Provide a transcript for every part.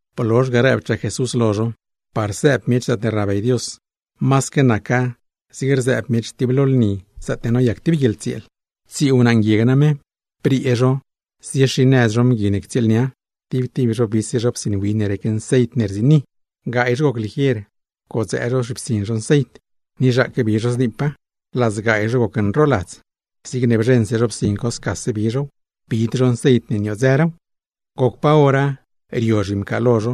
Blozh ga rëbchaa Jesús lo zho: ―Par sëëb miech zaatne rnabey Dios, masaque naca zig rzëëb miech tib lo lni zaatne noyac tib guieḻtsieel. ’Tsii wnaa nguieg name, briee zho ziexinëz zho mgui ne ctsieelnia, tib tib zho bise zho psin win ne rec nceit ne rziini. Gaay zho goc ligier pcodzëë zho zhipsin zho nceit, ni zhaaque bi zho zniipa; laa zgaay zho gocnroladz, zigne bzheṉse zho psin co scase bi zhow, bid zho nceit ne niodzëraaw. ’Goc pa hora rio zhimcaalo zho,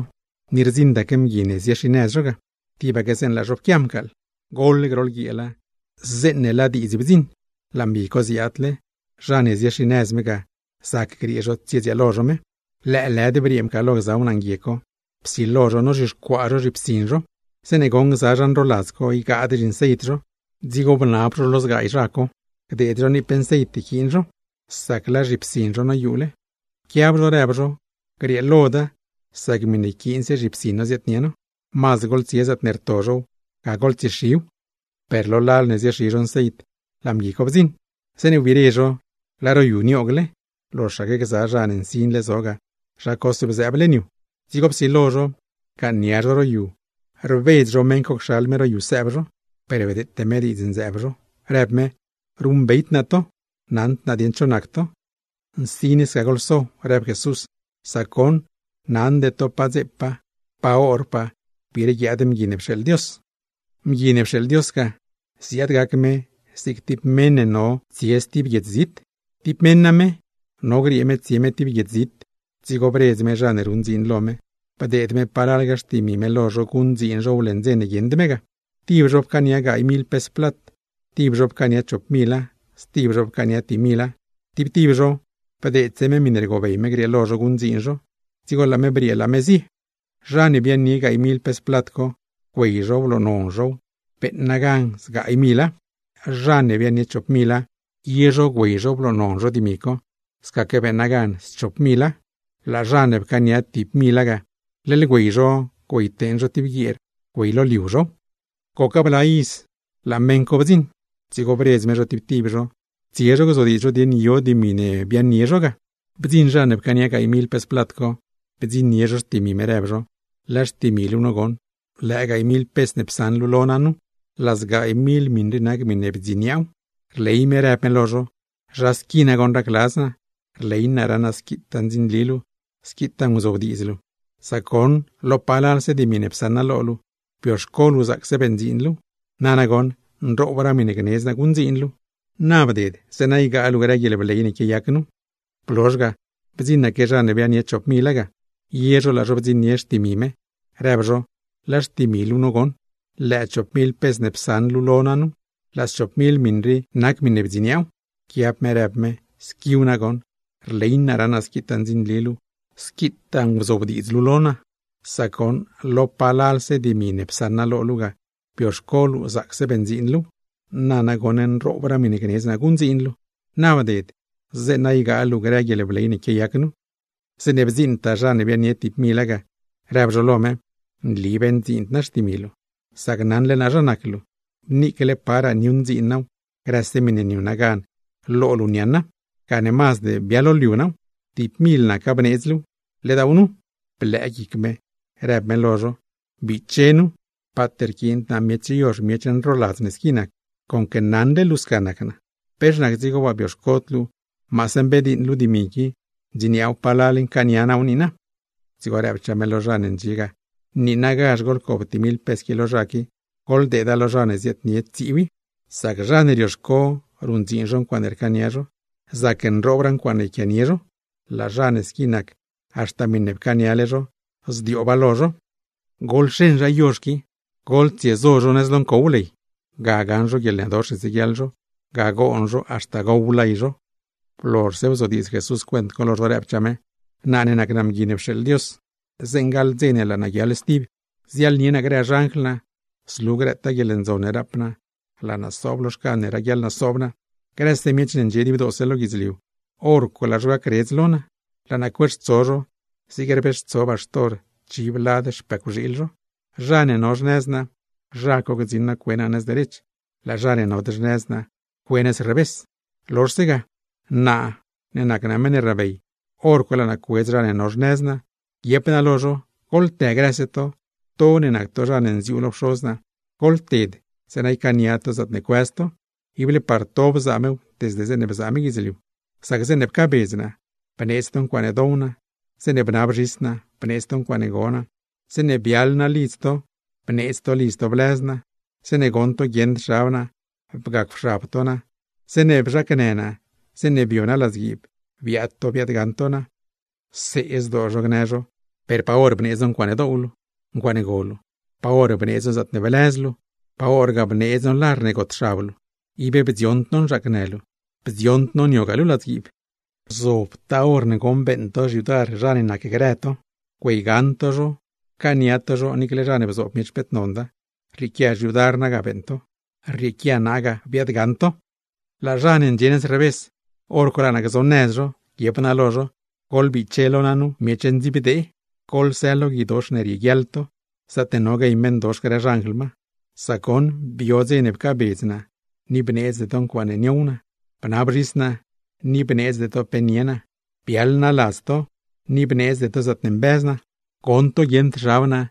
ni rdziṉdaque mgui ne ziexinëz zho ga, tibaque zeeṉ laa zho pquia mcaaḻ. Goḻ groḻ guieela, zeeṉ laa vis rac, laa mgui co ziaadle, zha ne ziexinëz me ga, zac griee zho tsiedzieel zho me. Lëëlëd briee mcaaḻlo gza wnaa nguieg co, psilo zho nozhixcuaa zho zhipsin zho. Zeeṉe goṉ gza zha nroladz co ygaadraa zhinceit zho, dzigo bnab zho lo zgaay zha co, gdeed zho niip nceit yquiin zho, sac laa zhipsin zho noyuule. Pquiab zho rëb zho: “Grieeloda, sac miṉe yquiinse zhipsin no ziaadnie no. Mazd goḻtsie zaatne rto zhow, ga goḻtsiexiw.” Per lo lal ne ziexi zho nceit, laa mgui co bdziṉ. Zeeṉe wbire zho, laa ro yu nioogle, loxaque gza zha ne nsinle zo ga, zha cose bzëëb leṉ yu. Dzigo psilo zho, rcaaṉ nia zho ro yu, rbedz zho mgui co cxal me ro yu sëëb zho. Per bdeete me diidz nzëëb zho, rëb me: “Ruṉbeyd naa to goṉ, naṉd naa dieṉ cho nac to.” ’¡Nsin sca goḻso! ―rëb Jesús―. Sac goṉ naṉde to pa dzepaa, pa horpagaa gbiire guiaad Mgui ne pxeeḻ Dios. ’Mgui ne pxeeḻ Dios ga, ziaad gac me zig tib meṉ ne no griee tsie tib viaj zit. ’Tib meṉ name no griee me tsie me tib guiedz zit, dzigo bredz me zha ne ruṉ dziin lo me, bdeed me palalga xtimi me lo zho guṉdziin zhow leṉ dze ne guieṉd me ga. Tib zho pcaania gaay mil pes plat, tib zho chop mila, stib zho pcaania tib mila. Tib tib zho, bdeedse me miṉe rgobey me grieelo zho guṉdziin zho, dzigo laa me briee laa me zie. ’Zha ne biaaṉnie gaay mil pes plat co, güey zho bloonon zhow, beeṉa gan zgaay mila. Zha ne biaaṉnie chop mila, ye zho güey zho bloonon zho dimi co, scaque beeṉa gan schop mila. Laa zha ne pcaania tib mila ga, leḻ güey zho güeyteeṉ zho tib guieer güeyloliu zhow. ’Goc bla iza laa meṉ co bdziṉ, dzigo bredz me zho tib tib zho, tsie zho gzodiidz zho dieṉ yo dimi ne biaaṉnie zho ga. ’Bdziṉ zha ne pcaania gaay mil pes plat co, bdziṉnie zho xtimi me, rëb zho: “Laa xtimi luu nu goṉ, lëë gaay mil pes ne psaṉ luu lo naa nu, laa zgaay mil miṉ rii nac miṉe bdziniaaw.” Rley me rëb me lo zho: “¡Zha squi nagoṉ racladz naa! Rley naa raṉ naa squitaa ndzinli luu, squitaa nguzobdiidz luu; sac goṉ lo palalse dimi ne psaṉ naa lo luu ga, bioxco luu zaacse beṉdziin luuw. Nana goṉ, nroobraa miṉe gnedz naa guṉdziin luu. ¡Na bded, zeeṉa ygaa luu grë guieḻbley ne quiayac nu!” ’Blozh ga, bdziṉaque zha ne biaaṉnie chop mila ga, ye zho laa zho bdziṉnie xtimi me, rëb zho: “Laa xtimi luu nu goṉ, lëë chop mil pes ne psaṉ luu lo naa nu, laa schop mil miṉ rii nac miṉe bdziniaaw.” Pquiab me rëb me: “¡Squiw nagoṉ! Rley naa raṉ naa squitaa ndzinli luu, squitaa nguzobdiidz luu lo naa; sac goṉ lo palalse dimi ne psaṉ naa lo luu ga, bioxco luu zaacse beṉdziin luuw. Nana goṉ, nroobraa miṉe gnedz naa guṉdziin luu. ¡Na bded, zeeṉa ygaa luu grë guieḻbley ne quiayac nu!” ’Zeeṉe bdziiṉtaa zha ne biaaṉnie tib mila ga, rëb zho lo me: “Nli beṉdziind naa xtimi luu, sac naṉle naa zha nac luu, niicle paraa niuṉdziin naaw, grëse miṉe niuṉa gan lo luu niaaṉa; gane mazd bialoliu naaw. Tib mil naca bneedz luuw, ledaaw nu.” Blëë guic me, rëb me lo zho: “¡Biche nu, paat rquiind naa miech yozh, miech nroladz ne squi nac! Conque naṉle luu sca nac naa, ¿pex nac dzigo waa bioxcod luu maase mbediiṉ luu dimi qui, ndziniaaw palal ncaania naaw niina?” Dzigo rëbchaa me lo zha ne ndxie ga: “Niinagazh goḻcob tib mil pes qui lo zha qui, goḻdeeda lo zha ne ziaadnie tsiiw i. Sac zha ne rioxco ruṉdziin ncuaaṉe rcaania zho, zacnroobraa ncuaaṉe yquianie zho. Laa zha ne squi nac, haxta miṉe pcaaniale zho, zdiooba lo zho. Goḻxeṉ zha yozh qui, goḻtsiesaṉ zho lo ncow nëz ley. Ga gaṉ zho guieḻnëdox ne tsieguiaḻ zho, ga goon zho haxta gow lay zho.” Blozhse bzodiidz Jesús cuent co lo zho, rëbchaa me: ―Naa ne nac naa Mgui ne pxeeḻ Dios, zeeṉ gaḻ dze ne laa naa guiaḻ stib, ziaḻnie naa grë xanjl naa, zlu grëtaa guieḻndzon ne rap naa, laa naa sob lo xcan ne raguiaḻ naa soob naa. Grëse miech ne ndxie dibdoose lo guidzliu, hor co laa zho gacredz lo naa, laa naa cueextso zho zig rbeextso baxtor chiv lad xpëcwxiil zho. Zha ne no xnëz naa, zha co gdziṉ naa cue naa nëz derech, laa zha ne nod xnëz naa, cue nëz revés. ’Lozhse ga, naa ne nac naa meṉ ne rnabey, hor co laa naa cuedz zha ne no xnëz naa, guiep naa lo zho: “Goḻtë grëse to, to ne nac to zha ne nziuu lo Pxoz naa. Goḻted zeeṉa ycaania to zaatne cuëz to, ible par to bzaa mew desde zeeṉe bzaa me guidzliu. Sac zeeṉe pcaabedz naa, bneedz to ncuaaṉe dow naa; zeeṉe bnab zhis naa, bneedz to ncuaaṉe go naa; zeeṉe biaḻ naa ladz to, bneedz to lidz to blëz naa; zeeṉe goṉ to guieṉd xab naa, bgacwxab to naa; zeeṉe bzhacnë naa, zeeṉe bio naa ladzguiib, biaad to biaadgaṉ to naa.” See zdoo zho gnë zho: “¿Per pa hor bneedz no ncuaaṉe doow luu, ncuaaṉe go luu, pa hor bneedz no zaatne blëz luu, pa horgaa bneedz no lar ne gotxab luu, ib bdzioṉd no nzhaacnë luu, bdzioṉd no niogaa luu ladzguiib?” ’Dzigo guiep naa lo zho: “Gzobtaa hor ne goṉ beeṉ to xyudar zha ne nacgrë to, güeygaṉ to zho, pcaaniagaa to zho, niicle zha ne bzoob miech peet nonda, rrieequia xyudar naa ga beeṉ to, rrieequia naa ga biaadgaṉ to.” ’Laa zha ne ndxie nëz revés, hor co laa naa gzonëz zho, guiep naa lo zho: “¡Goḻbiche lo naa nu, miech ndziibdee! ¡Goḻsë lo guidox ne rieguiaḻ to, zaatne no guey meṉdox grë xanjl ma! Sac goṉ, bio dze pcaabedz naa ni bneedzde to ncuaaṉe niow naa; bnab zhis naa, ni bneedzde to pe nie naa. Biaḻ naa ladz to, ni bneedzde to zaatne mbëz naa; goṉ to guieṉd xab naa,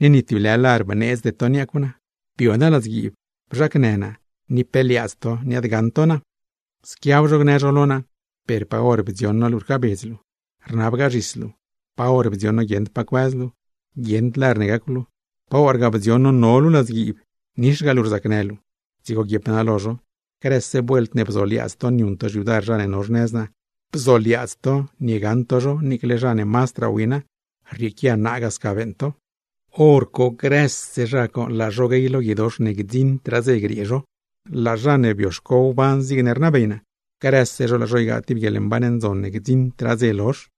ni ni tib lë lar bneedzde to niacw naa. Bio naa ladzguiib, bzhacnë naa, ni pe liaadz to niaadgaṉ to naa.” ’Squiab zho gnë zho lo naa: “Per pa hor bdzioṉ no luu rcaabedz luu, rnabgaa zhis luu; pa hor bdzioṉ no guieṉd pa cuëz luu, guieṉd lar ne gacw luu; pa horgaa bdzioṉ no no luu ladzguiib, nixgaa luu rzacnë luu.” ’Dzigo guiep naa lo zho: “Grëse vuelt ne bzoliaadz to niuṉ to xyudar zha ne no xnëz naa, bzoliaadz to niegaṉ to zho niicle zha ne mazdraa wina, rrieequia naa ga sca beeṉ to.” ’Horco grëse zha co laa zho guey lo guidox ne gdziṉdraa dze griee zho; laa zha ne bioxco wban zigne rnabey naa, grëse zho laa zho ygaa tib guieḻmban ndzon ne gdziṉdraa dze lozh.